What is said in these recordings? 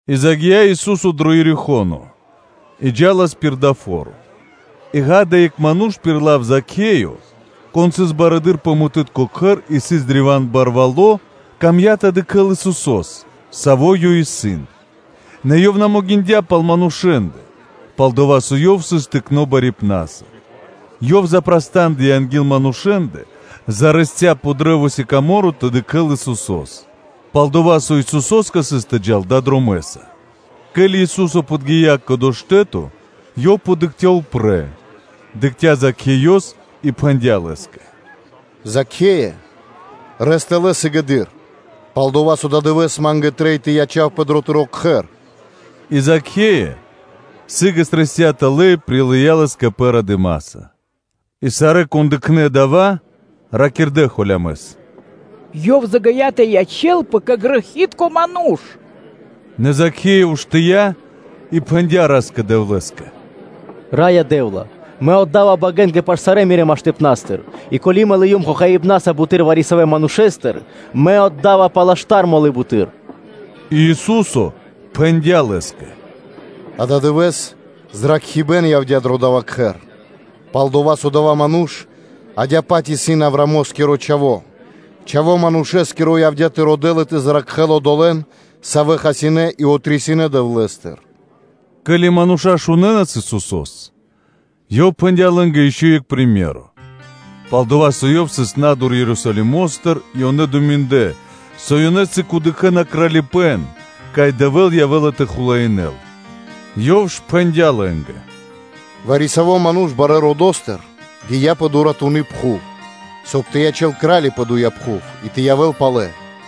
И загия́ Ису́со дро Ерихо́но и джа́лас пир дава́ фо́ро. И, ґа́да, екх ману́ш, пир лав Закхеё, кон сыс барыдыро́ пэ мытытко (таксытко) кхэр и сыс древа́н барвало́, ёв камдя́ тэ дыкхэ́л Исусо́с, Саво́ Ёв исын, нэ ёв на могиндя́ пал манушэ́ндэ, пал-дова́ со ёв сыс тыкно́ барипнаса. Ёв запрастандыя анги́л, зарэсця пэ кашт-сикаморо тэ дыкхэ́л Исусо́с, пал-дова́ со Исусо́скэ трэиндя́ тэ джал далэ́ дромэ́са. Ке́ли Ису́со подги́я кэ дова́ штэ́то, Ёв дыкхця́ упрэ́, дыкхця́ Закхеёс и пхэндя́ Лэ́скэ: “Закхее! Рэс тэлэ́ сыгэды́р, пал-дова́ со ададывэ́с Ма́нгэ трэй тэ ячавпэ дро тыро́ кхэр.” И Закхеё сы́гэс рэсця тэлэ́ и прилыя́ Лэс кэ пэ радыма́са. И сарэ́, кон дыкхнэ́ дава́, ракирдэ́ холямэс: “Ёв загия́ тэ ячэ́лпэ кэ грэхи́тко ману́ш.” Нэ Закхеё уштыя́ и пхэндя́ Ра́скэ-Дэвлэ́скэ “Раё Дэ́вла! Мэ отда́ва богэнгэ паш сарэ́ Мирэ́ миштыпна́стыр и, ко́ли мэ лыём хохаибнаса буты́р вари-савэ́ манушэ́стыр, мэ да́ва палэ штар мо́лы буты́р.” И Ису́со пхэндя́ Лэ́скэ: “Ададывэ́с зракхибэ́н явдя́ дро дава́ кхэр, пал-дова́ со адава́ ману́ш адя́кэ-паць исын Авраамо́скиро чхаво́; Чхаво́ Манушэ́скиро явдя́ тэ родэ́л и тэ зракхэ́л одолэ́н, савэ́ хасинэ́ и отрисинэ Дэвлэ́стыр.” Ке́ли мануша́ шунэнас Исусо́с, Ёв пхэндя́ лэ́нгэ ишчо (инкэ́) екх приме́ро (сыкаибэ́н), пал-дова́ со Ёв сыс на́дур Ерусалимо́стыр и ёнэ думиндлэ, со ёнэ сыг явэ́на тэ дыкхэ́н Кралипэ́н, кай Дэвэ́л явэ́ла тэ хулаинэ́л. Ёв ж пхэндя́ лэ́нгэ: “Вари-саво́ ману́ш барэ́ родо́стыр гия́ барэ́ дромэ́са, соб (кай) тэ ячэ́л крали́са пэ доя́ пхув и тэ явэ́л палэ.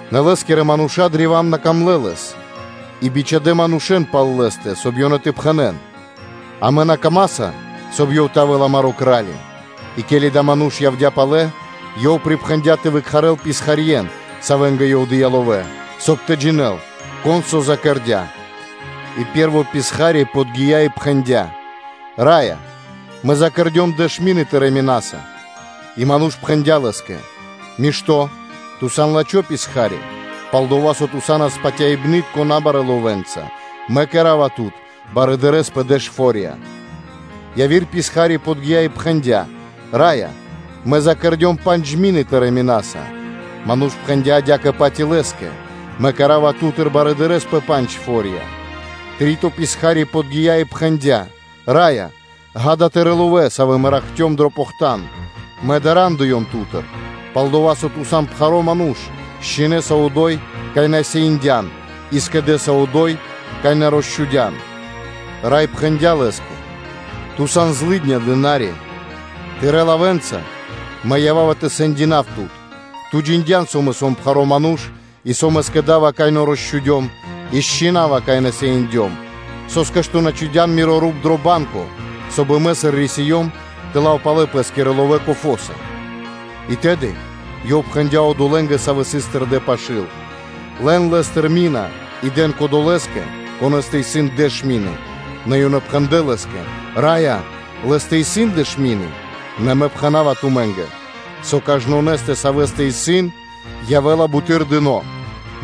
Нэ лэ́скирэ манушэ́нгэ сыс древа́н на пир ило́, и бичхадэ́ манушэ́н пал лэ́стэ, соб (кай) ёнэ тэ пхэнэ́н: ‘Амэ на камаса, соб (кай) ёв тэ явэ́л амаро́ кра́ли’. И ке́ли адава́ ману́ш явдя́ палэ, ёв припхэндя́ тэ выкхарэл писхарье́н, савэ́нгэ ёв дыя́ ловэ́, соб (кай) тэ джинэ́л, кон со закэрдя. И пэ́рво писха́ри подги́я и пхэндя́: ‘Раё! Мэ закэрдём дэш мины тырэ́ минаса’. И ману́ш пхэндя́ лэ́скэ: ‘Мишто́, ту сан лачхо́ писха́ри; пал-дова́ со ту са́нас патяибны́тко набарэ́ ловэнца, мэ кэра́ва тут барыдырэ́са пэ дэш фо́рья’. Яви́р писха́ри подги́я и пхэндя́: ‘Раё! Мэ закэрдём пандж мины тырэ́ минаса’. Ману́ш пхэндя́ адя́кэ-паць и лэ́скэ: ‘Мэ кэра́ва тут барыдырэ́са пэ пандж фо́рья’. Три́то писха́ри подги́я и пхэндя́: ‘Раё! Ѓа́да, тырэ́ ловэ́, савэ́ мэ ракхцём дро похтан. Мэ дарандыём ту́тыр, пал-дова́ со ту сан пхаро́ ману́ш: счхинэса одо́й, кай на сеиндян, и скэдэса одо́й, кай на росчхудян’. Рай пхэндя́ лэ́скэ: ‘Ту сан злыдня дына́ри, тырэ́ лавэ́нца мэ ява́ва тэ сэндинав тут: ту джиндян, со мэ сом пхаро́ ману́ш и со мэ скэда́ва, кай на росчхудём и счинава, кай на сеиндём. Со́скэ ту на чхудя́н миро руп дро банко, соб (кай) мэ, сыр рисиём, тэ лав палэ пэ́скирэ ловэ́ кофоса’. И тэды ёв пхэндя́ одолэ́нгэ, савэ́ сыс тэрдэ́ пашы́л: ‘Лэн лэ́стыр мина и дэн кодолэ́скэ, конэ́стэ исын дэш мины’. Нэ ёнэ пхэндлэ́ лэ́скэ: ‘Раё! Лэ́стэ исын дэш мины’. “Нэ мэ пхэна́ва тумэ́нгэ, со кажнонэ́скэ, савэ́стэ исын, явэ́ла буты́р дыно́,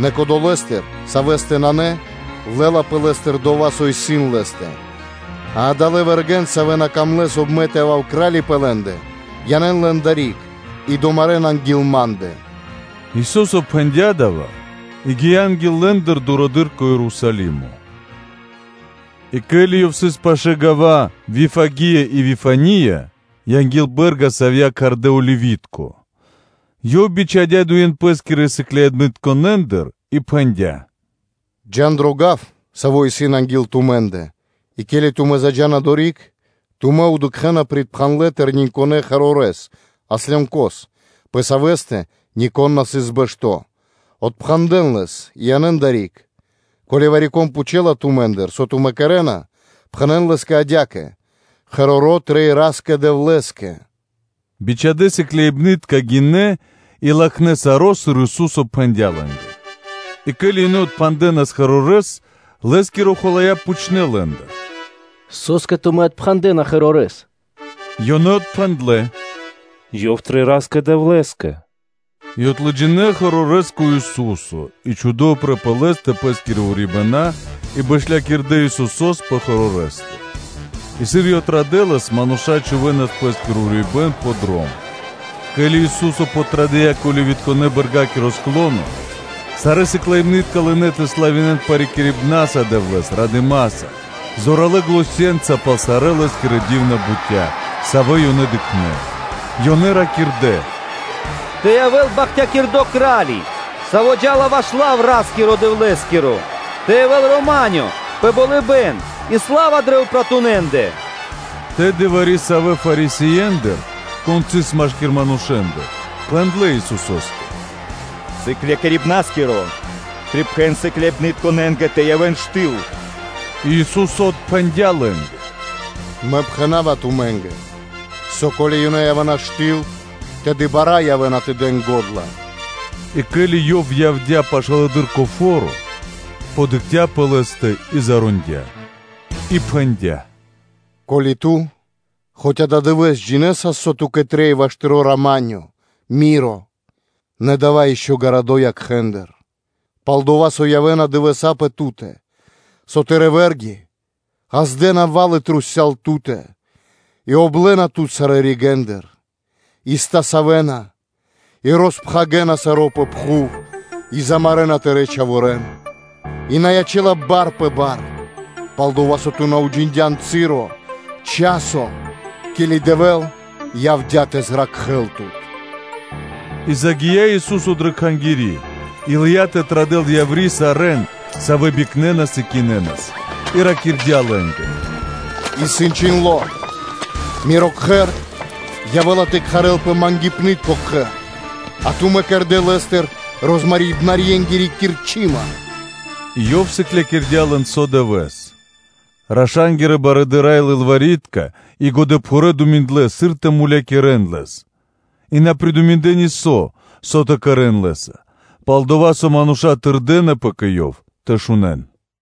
нэ кодолэстыр, савэ́стэ нанэ, лэ́лапэ лэ́стыр дова́, со исын лэ́стэ.” А адалэ́ вэргэ́н, савэ́ на камлэ́, соб (кай) мэ тэ явав кра́ли пэ лэ́ндэ, янэ́н лэн адари́к и домарэн анги́л ма́ндэ.’” Ису́со пхэндя́ дава́ и гия́ анги́л лэ́ндэ дурэды́р кэ Ерусалимо. И ке́ли Ёв сыс пашы́л гава́ Вифагия и Вифания, анги́л бэ́рга, савья́ кхардэ́ Оливи́тко (Елеоноскири), Ёв бичхадя́ дуе́н Пэ́скирэ сыкляибнытконэндыр и пхэндя́: “Джа́н дро гав, саво́ исын анги́л тумэ́ндэ, и ке́ли тумэ́ заджа́на одори́к, тумэ́ дыкхэ́на припхандлэ тэрнэ́ осло́с (мегари́с), пэ савэ́стэ нико́н на сыс бэшто́, отпхандэн лэс и янэ́н адари́к. Ко́ли вари-кон пхучэла тумэ́ндыр, ‘Со тумэ́ кэрэ́на’, пхэнэ́н адя́кэ лэ́скэ: ‘Ёв трэй Ра́скэ-Дэвлэ́скэ’. Бичхадэ́ сыкляибны́тка гинэ́ и латхнэ́ саро́, сыр Ису́со пхэндя́ лэ́нгэ. И ке́ли ёнэ отпхандэнас ослёнкос, лэ́скирэ хулая́ пхучнэ́ лэ́ндыр: ‘Со́скэ тумэ́ отпхандэна ослёнкос’. Ёнэ отпхэндлэ́: “Ёв трэй Ра́скэ-Дэвлэ́скэ”, и отлыджинэ ослёнкос кэ Ису́со; и чхудэ́ упрэ́ пэ лэ́стэ пэ́скирэ урибэна́, и бэшлякирдэ Исусо́с пэ ослёнкостэ. И сыр Ёв традэлас, мануша́ чхувэ́нас пэ́скиро урибэ́н пэ дром. Ке́ли Ису́со подтрадыя кэ Оливитконэ-Бэргакиро склоно, сарэ́ сыкляибны́тка лынэ́ тэ славинэ́н парикирибнаса Дэвлэ́с радыма́са, зоралэ́ заненца пал сарэ́ Лэ́скирэ ди́вна бутя́, савэ́ ёнэ дыкхнэ́; ёнэ ракирдэ́: “Тэ явэ́л бахтякирдо́ Кра́ли, Саво́ джа́ла ваш лав Дэвлэ́скиро! Тэ явэ́л рама́нё (миро) пэ болыбэ́н и сла́ва дрэ упратунэндэ.” Тэды вари-савэ́ Фарисиендыр, кон сыс машки́р манушэ́ндэ, пхэндлэ́ Исусо́скэ: “Сыклякирибнарискиро! Припхэн сыкляибнытконэ́нгэ тэ явэ́н штыл!” И Ису́со отпхэндя́ лэ́нгэ: “Мэ пхэна́ва тумэ́нгэ, со ко́ли ёнэ явэ́на штыл, тэды бара́ явэ́на тэ дэн го́дла.” И ке́ли Ёв явдя́ пашылэды́р кэ фо́ро, дыкхця́ пэ лэ́стэ и зарондя, и пхэндя́: “Ко́ли ту хоць ададывэ́с джинэсас, со ту́кэ трэй ваш тыро́ рама́нё (миро)! Нэ дава́ ишчо (инкэ́) гарадо́ якхэ́ндыр”; пал-дова́ со явэ́на дывэса́ пэ ту́тэ, со тырэ́ вэ́рги ґаздэ́на барикады трусця́л ту́тэ и облэна тут сарэ́ ригэ́ндыр; и стасавэна тут сарэ́ ригэ́ндыр, и роспхагирэна саро́ пэ пхув и замарэна тырэ́ чхаворэ́н: и на ячэ́ла бар пэ бар, пал-дова́ со ту на уджиндян часо, ке́ли Дэвэ́л явдя́ тэ зракхэ́л тут.” И загия́ Ису́со дрэ Кхангири́ и лыя́ тэ традэл яври́ сарэ́н, савэ́ бикнэнас и кинэнас, и ракирдя́ лэ́нгэ: “Исын чхиндло́: ‘Миро кхэр явэ́ла тэ кхарэлпэ ‘мангипнытко кхэр,’ а тумэ́ кэрдэ́ лэ́стыр розмарибнарьенгири кирчыма.’” И Ёв сыклякирдя́ лэн со дывэ́с; раша́нгирэ барыдыра́ и лылвари́тка и годэпхурэ́ думиндлэ, сыр тэ хасякирэ́н Лэс, и на придуминдлэ нисо́, со тэ кэрэ́н Лэ́са, пал-дова́ со мануша́ тырдынэпэ кэ Ёв тэ шунэ́н.